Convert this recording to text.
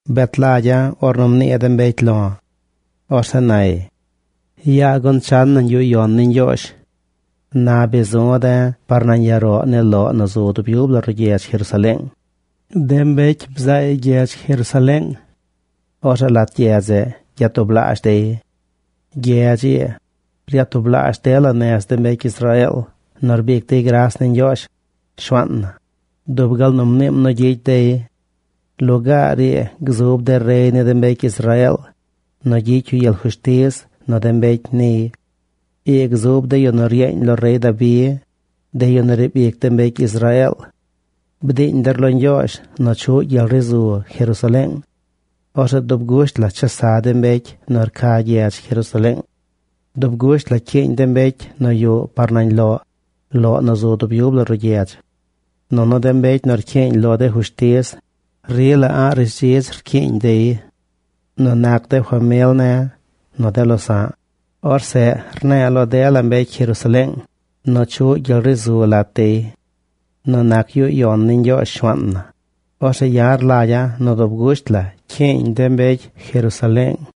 Bet lagya̱ ornu mnii de mbecy lo̱. Orzeꞌ nay: “Yaa gun chan nañ yuꞌ yon ni Ñgyoozh.” Na bi zu̱ de̱ par nañ ya roꞌ ni loꞌ nu zu dub yub la ruꞌ gyedz Jerusaleeng. De mbecy bzaay gyedz Jerusaleeng. Orzeꞌ lat gyedz zeꞌ gyatublaazh dey. Gyedz ii, ryatublaazh dela nez de mbecy Israeel nu rbic dey gras ni Ñgyoozh, Shuaan na, dub gal nu mniim nu gyicy dey. Lugaar ii gzub de rey ni de mbecy Israeel nu gyicy yu gyel fushtiz nu de mbecy niy. Ii gzub de yu nu ryeeñ lo rey Dabi, de yu nu riib ic de mbecy Israeel. Bdiiñ der lo Ñgyoozh nu chuꞌ gyel ri zu Jerusaleeng. Orzeꞌ dub gusht la chesa de mbecy nu rca gyedz Jerusaleeng. Dub gusht la cyiiñ de mbecy nu yuꞌ par nañ loꞌ, loꞌ nu zu dub yub la ruꞌ gyedz. Nunu de mbecy nu rcyiiñ lo de fushtiz, rila a̱ꞌ rishdzidz cyiiñ dey. Nu nac de famil ne̱ nu de losa̱ꞌ, orzeꞌ rne̱e̱ lo dela mbecy Jerusaleeng nu chuꞌ gyel ri zu lat dey. Nu nac yuꞌ yon ni Ñgyoozh, Shuaan na, orzeꞌ ya̱ rlagya̱ nu dub gusht la cyiiñ de mbecy Jerusaleeng.